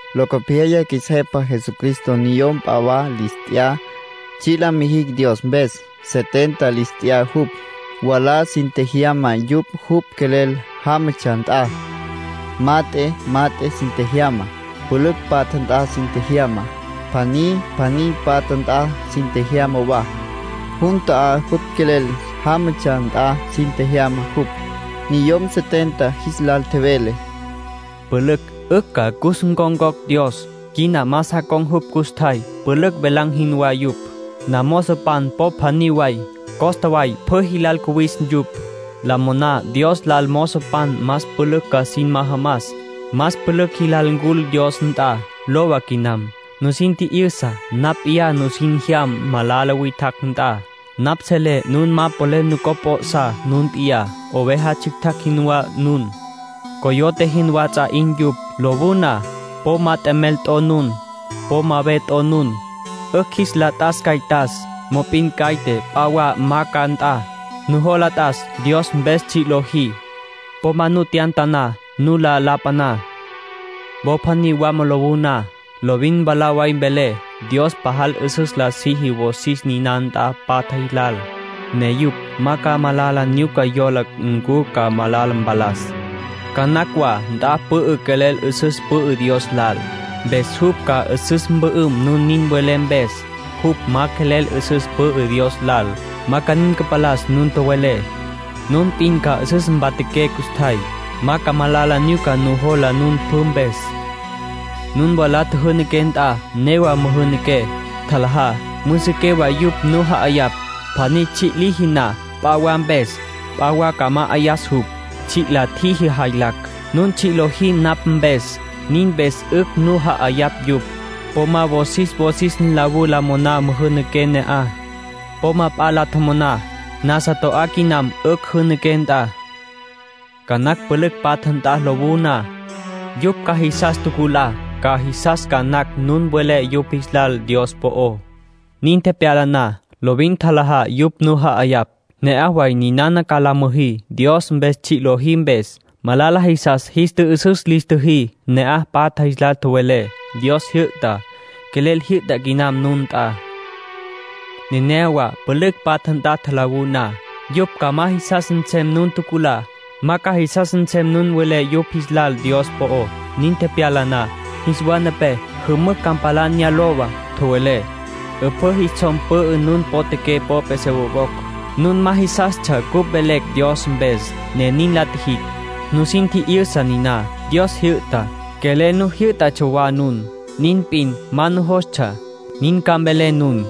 Locopyaya qjuis Jepa Jesucristo niyom p'a wa lis t'ya, tsji' la mijicj Dios mpes. Setenta lis t'ya jupj. Mwalá sin tjejyama yupj jupj quelel jámatsja nt'a. Mat'e mat'e sin tjejyama. Pülücj patja nt'a sin tjejyama. Pjaní pjaní patja nt'a sin tjejyama wa. Jun ta'á jupj quelel jámatsja nt'a sin tjejyama jupj. Niyom setenta jis lal tjevele: “Pülücj 'ücj ca cus ncon̈cocj Dios, quina ma sa con̈ jupj custjay. Pülücj velan̈ jinwá yupj. Namozopan po pjaní way. Costa way pjü jilal la cuwis yupj. La moná Dios lal mozopan más pülücj ca sin majamas, más pülücj jilal ncul Dios nt'a. ”Lowa quinam. Nusin tji'yüsa: napj p'iyá nusin jyam malala witjacj nt'a. Napj selé nun ma polel nucopj p'o'sá nun p'iyá. Oveja tsjictjacj jinwá nun. Coyote jinwá ts'a 'in yupj. Lowú na, po ma t'emel t'o nun. Po ma ve t'o nun. 'Ücj jis la t'as caitas, mop'in caite p'a wa ma ca nt'a. Nujola t'as Dios mpes tsji' lojí. Po ma nu tyantaná nu la lapaná. ”Wo pjaní wama lowú na, lovin mwalá way mvelé: ‘Dios pajal 'üsüs la siji wosis niná nt'a patja jilal, ne yupj ma ca malala nyuca yola ncu ca malala mpalas’. Ca nacj wa nt'a pü'ü quelel 'üsüs pü'ü Dios lal, mpes jupj ca 'üsüs mpü'üm nun nin tjowelé mpes. Jupj ma quelel 'üsüs pü'ü Dios lal, ma ca nin cüpalas nun tjowelé. Nun p'in ca 'üsüs mpatjaqué custjay. Ma ca malala nyuca nujola nun pjü mpes. Nun mwalá tjüjünaqué nt'a newa müjünaqué. Tjalajá, müsiqué wa yupj nu ja'ayapj. Pjaní tsji' liji na p'a wa mpes, p'a wa ca ma'ayas jupj, tsji' la tjiji jaylacj. Nun tsji' lojí napj mpes. Nin mpes 'ücj nu ja'ayapj yupj. Po ma wosis wosis nlawú la moná müjünaqué ne'aj. Po ma p'a la tjomoná, nasa to'á quinam 'ücj jünaque nt'a. ”Ca nacj pülücj patja nt'a lowú na, yupj ca jisas tjuculá, ca jisas ca nacj nun welé yupj jis lal Dios po'ó. Nin tepyala na, lovin tjalajá yupj nu ja'ayapj. Ne'aj way ninana ca la müjí Dios mpes tsji' lojí mpes. Malala jisas jis tjü'ü'süs lis tjüjí. Ne'aj patja jis lal tjowelé: ‘Dios jyü'ta. Quelel jyü'ta quinam nun nt'a.’ Nenéyawa pülücj patja nt'a tjalawú na, yupj ma ca jisas nsem nun tjuculá, ma ca jisas nsem nun welé yupj jis lal Dios po'ó. Nin tepyala na, jis wa nepé jümücj campalanya lowa. Tjowelé: ‘'Üpjǘ qjuis tsjom pü'ü nun potjaqué popé se wowojocj. Nun ma jisastsja cupj tjevelecj Dios mpes, ne nin la tjijicj. Nusin tji'yüsa niná: Dios jyü'ta. Quelel nu jyǘ'tatsja wa nun, nin p'in ma nujostsja.’ Nin ca mvelé nun.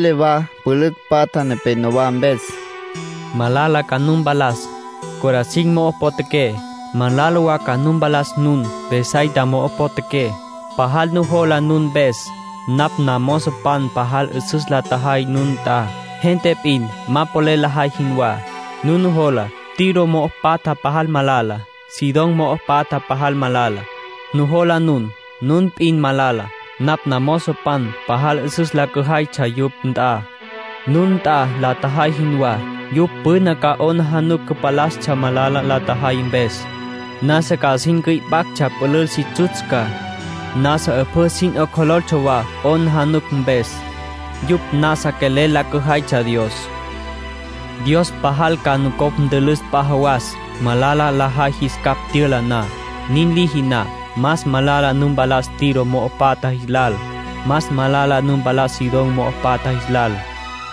Tjevele wa pülücj patja nepénowa mpes: “Malala ca nu mpalas, Corazín mo'o potjaqué. Malala wa ca nu mpalas nun, Betsaida mo'o potjaqué. Pajal nola nun mpes. Napj namozopan pajal 'üsüs la tjajay nun nt'a, gente p'in ma polel lajay jinwá. Nun nujola Tiro mo'o patja pajal malala. Sidón mo'o patja pajal malala, nujola nun. Nun p'in malala. Napj namozopan pajal 'üsüs la cüjaytsja yupj nt'a, nun nt'a la tjajay jinwá, yupj püna ca 'aplijila cüpalastsja malala la tjajay mpes. Nasa ca sin 'ücüipaptsja pülül si tsutsca, nasa 'üpjǘ sin 'ücjololtsja wa 'aplijila mpes. Yupj nasa quelel la cüjaytsja Dios. Dios pajal ca nucopj ntülüs p'a jawas, malala lajay jis capj tyüla na. Nin liji na, más malala nu mpalas Tiro mo'o patja jis lal. Más malala nu mpalas Sidón mo'o patja jis lal.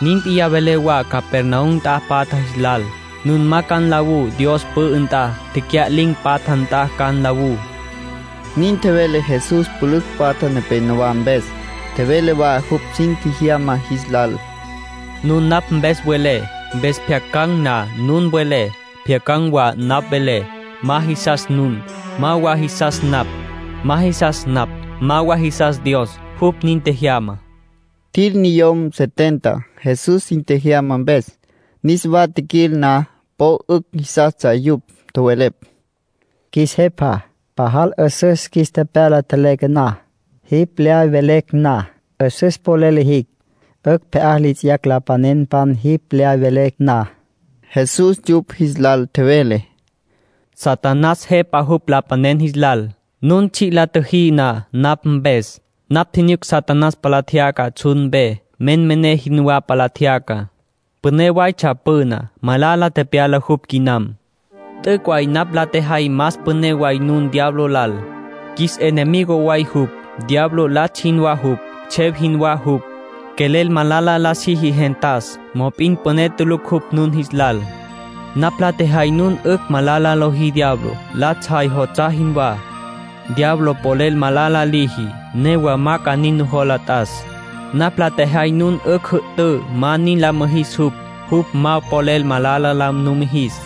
Nin p'iyá velé wa Capernaum nt'a patja jis lal. Nun ma ca nlawú Dios pü'ü nt'a. Tecya'lin̈ patja nt'a ca nlawú”, nin tjevele Jesús pülücj patja nepénowa mpes. Tjevele wa jupj sin tjejyama jis lal: “Nun napj mpes welé. Mpes pjyacan̈ na nun welé, pjyacan̈ wa napj velé. Ma jisas nun, ma wa jisas napj. Ma jisas napj, ma wa jisas Dios. Jupj nin tjejyama”, nin tjevele Jesús. Tjil niyom setenta, Jesús sin tjejyama mpes. Niswá tjiquil na, po 'ücj jisastsja yupj. Tjowelepj: —Qjuis Jepa, pajal 'üsüs qjuis tepyala tjeleque na. Jipj lyá velecj na, 'üsüs polel lijicj. 'Ücj pje'á li ts'iyacj lapanenpan jipj lyá velecj na. Jesús yupj jis lal tjevele: —Satanás jepa jupj lapanenpan jis lal. Nun tsji' la tjüjí na napj mpes, napj tjinyuc Satanás palá tjeyaca tsjun nepé. Menmené jinwá palá tjeyaca. Püné waytsja püná. Malala tepyala jupj quinam. T'üc' way napj la tjejay más püné way nun diablo lal. Qjuis enemigo way jupj. Diablo latsj jinwá jupj, tsjev jinwá jupj. Quelel malala la siji gentas. Mop'in püné tulucj jupj nun jis lal. Napj la tjejay nun 'ücj malala lojí diablo, latsj jay jotsjá jinwá. Diablo polel malala liji, newa ma ca nin nujola t'as. Napj la tjejay nun 'ücj jü'tǘ ma nin la mijis jupj. Jupj ma polel malala la numijis.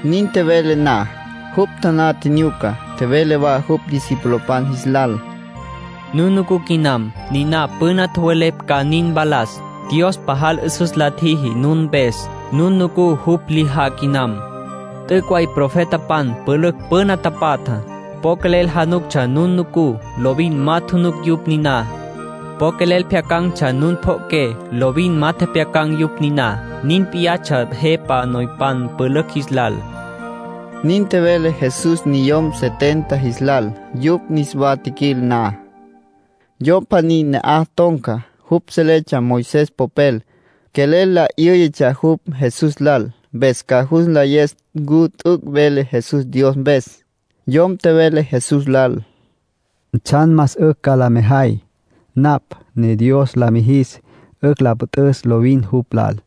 Nin tjevele na, jupj taná tjinyuca, tjevele wa jupj discipulopan jis lal: “Nun nucú quinam, niná püna tjowelepj ca nin mpalas. Dios pajal 'üsüs la tjiji nun mpes nun nucú jupj lijá quinam. T'üc' way profetapan pülücj püna tapatjá, po quelel januctsja nun nucú, lovin ma tjunuc yupj niná. Po quelel pjyacan̈tsja nun pjo'oqué, lovin ma tjepjyacan̈ yupj niná. Nin p'iyatsja jepa noypan pülücj jis lal.” Nin tjevele Jesús niyom setenta jis lal, yupj niswa tjiquil na. Yom pjaní ne'aj ton̈ca, jupj seletsja Moisés popel. Quelel la 'yǘyatsja jupj Jesús lal, mpes ca jus nlayes ncu t'üc' vele Jesús Dios mpes. Yom tjevele Jesús lal: —¿Tsjan más 'ücj la mejay napj ne Dios la mijis 'ücj mpü'üs lovin jupj lal?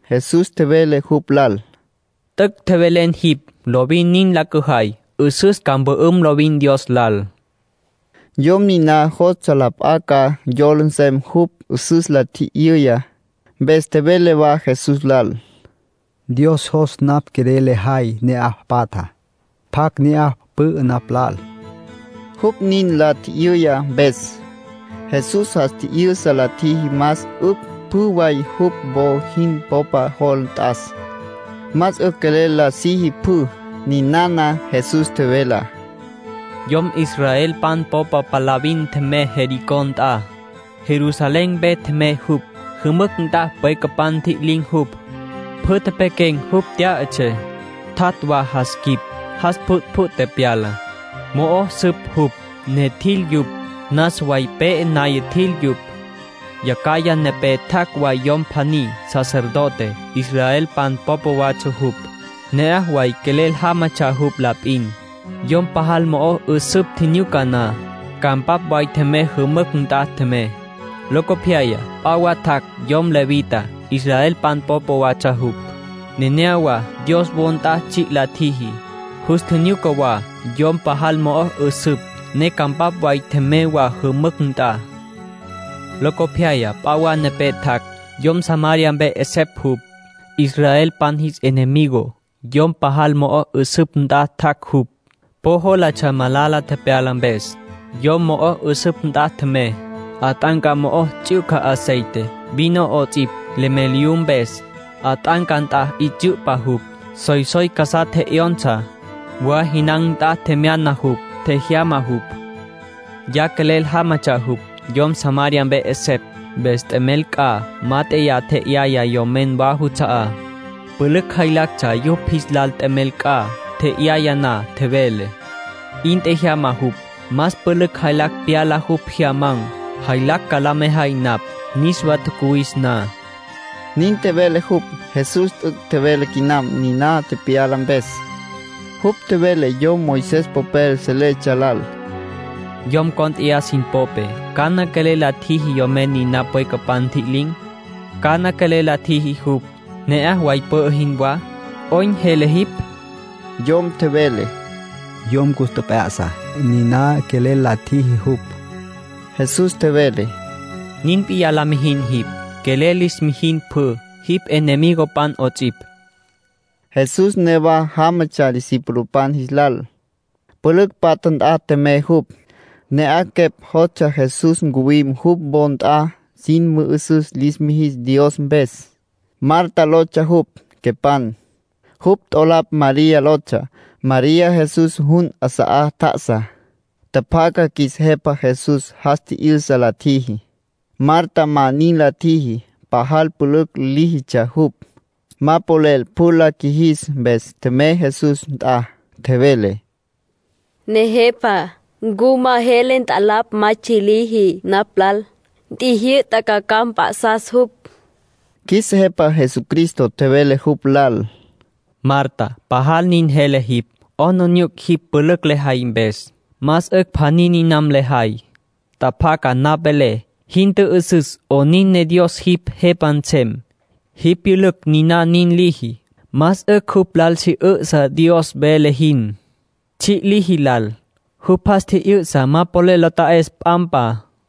Jesús tjevele jupj lal: —T'üc' tjevelen jipj. Lovin nin la cüjay, 'üsüs ca mpü'üm lovin Dios lal. Yom niná jostsja la p'a ca yola nsem jupj 'üsüs la tji'yüya, mpes tjevele wa Jesús lal: —Dios jos napj quelel lejay ne'aj patjá. ¿Pjacj ne'aj pü'ü napj lal? Jupj nin la tji'yüya mpes, Jesús jas tji'yüsa la tjiji más 'ücj pjü way jupj wo jin popa jola t'as. Más 'ücj quelel la siji pjü. Ninana Jesús tjevelá: —Yom israelpan popa palavin tjemey Jericó nt'a. Jerusalén mpe tjemey jupj. Jümücj nt'a pwecapan ntji'lin̈ jupj. Pjü tepequen̈ jupj tya'atsjé, tjat' wa jas quip, jas pjütpjüt' tepyala. Mo'o süp jupj, ne tjil yupj. Nasa way pe'e naya, tjil yupj. Yacjaya nepé tjac' wa yom pjaní, sacerdote. Israelpan popa watsja jupj. Ne'aj way quelel jámatsja jupj la p'in. Yom pajal mo'o 'üsüp tjinyuca na, campapj way tjemey jümücj nt'a, tjemey. Locopyaya, p'a wa tjac', yom levita. Israelpan popa watsja jupj. Nenéyawa Dios wo nt'a tsji' la tjiji. Jus tjinyuca wa yom pajal mo'o 'üsüp, ne campapj way tjemey wa jümücj nt'a. Locopyaya p'a wa nepé tjac', yom Samaria mpe 'esepj jupj, israelpan jis enemigo. Yom pajal mo'o 'üsüp nt'a tjac' jupj. Po jólatsja malala tepyala mpes. Yom mo'o 'üsüp nt'a tjemey. 'At'anca mo'o ts'yuca aceite, vino 'ots'ipj, leméliyu mpes. 'At'anca nt'a tsyu'pa jupj. Soysoy casá tje'yonsa. Wa jinan̈ nt'a tjemyana jupj, tjejyama jupj. Ya quelel jámatsja jupj, yom Samaria mpe 'esepj. Mpes t'emel c'a mát'eya tje'yaya yomen wa juts'a'á. Pülücj jaylactsja yupj jis lal t'emel c'a. Tje'yaya na, tjevele: ‘'In tjejyama jupj. Más pülücj jaylacj pyala jupj jyaman, jaylacj ca la mejay napj, niswa tjacuwis na’ —nin tjevele jupj. Jesús t'üc' tjevele quinam niná tepyala mpes. Jupj tjevele yom Moisés popel seletsja lal: —Niyom cónt'eya sin popé ¿cana quelel la tjiji yomen niná pwecapan ntji'lin̈? ¿Cana quelel la tjiji jupj, ne'aj way pü'ü jinwá? ¿'Oyn jele jipj? Yom tjevele: —Yom cus tjep'ya'sa, niná quelel la tjiji jupj. Jesús tjevele: —Nin p'iyá la mijin jipj. Quelel lis mijin pjü, jipj enemigopan 'ots'ipj. Jesús newa jámatsja discipulopan jis lal. Pülücj patja nt'a tjemey jupj. Ne'aj quepj jostsja Jesús ncuwim jupj wo nt'a sin mü'üsüs lis mijis Dios mpes. Marta lotsja jupj, quepan. Jupj t'olapj María lotsja. María Jesús jun 'asa'á tjá'asa, tjapjaca qjuis Jepa Jesús jas tji'yüsa la tjiji. Marta ma nin la tjiji. Pajal pülücj líjitsja jupj. Ma polel pjü la qjuijis. Mpes tjemey Jesús nt'a, tjevele: —Nejepa ¿ncu ma jele nt'alapj ma tsji' liji napj lal? Tjijyü'ta ca ncapj mp'a'sas jupj. Qjuis Jepa Jesucristo tjevele jupj lal: —Marta, pajal nin jele jipj, 'aplijila jipj pülücj lejay mpes. Más 'ücj pjaní ninam lejay. Tjapjaca napj velé, jin tjü'üsüs 'onin ne Dios jipj Jepa nsem. Jipj pyülücj niná nin liji. Más 'ücj jupj lal si 'üsǘ Dios vele jin, tsji' liji lal. Jupj jas tji'yüsa ma polel lo ta'es p'ampa.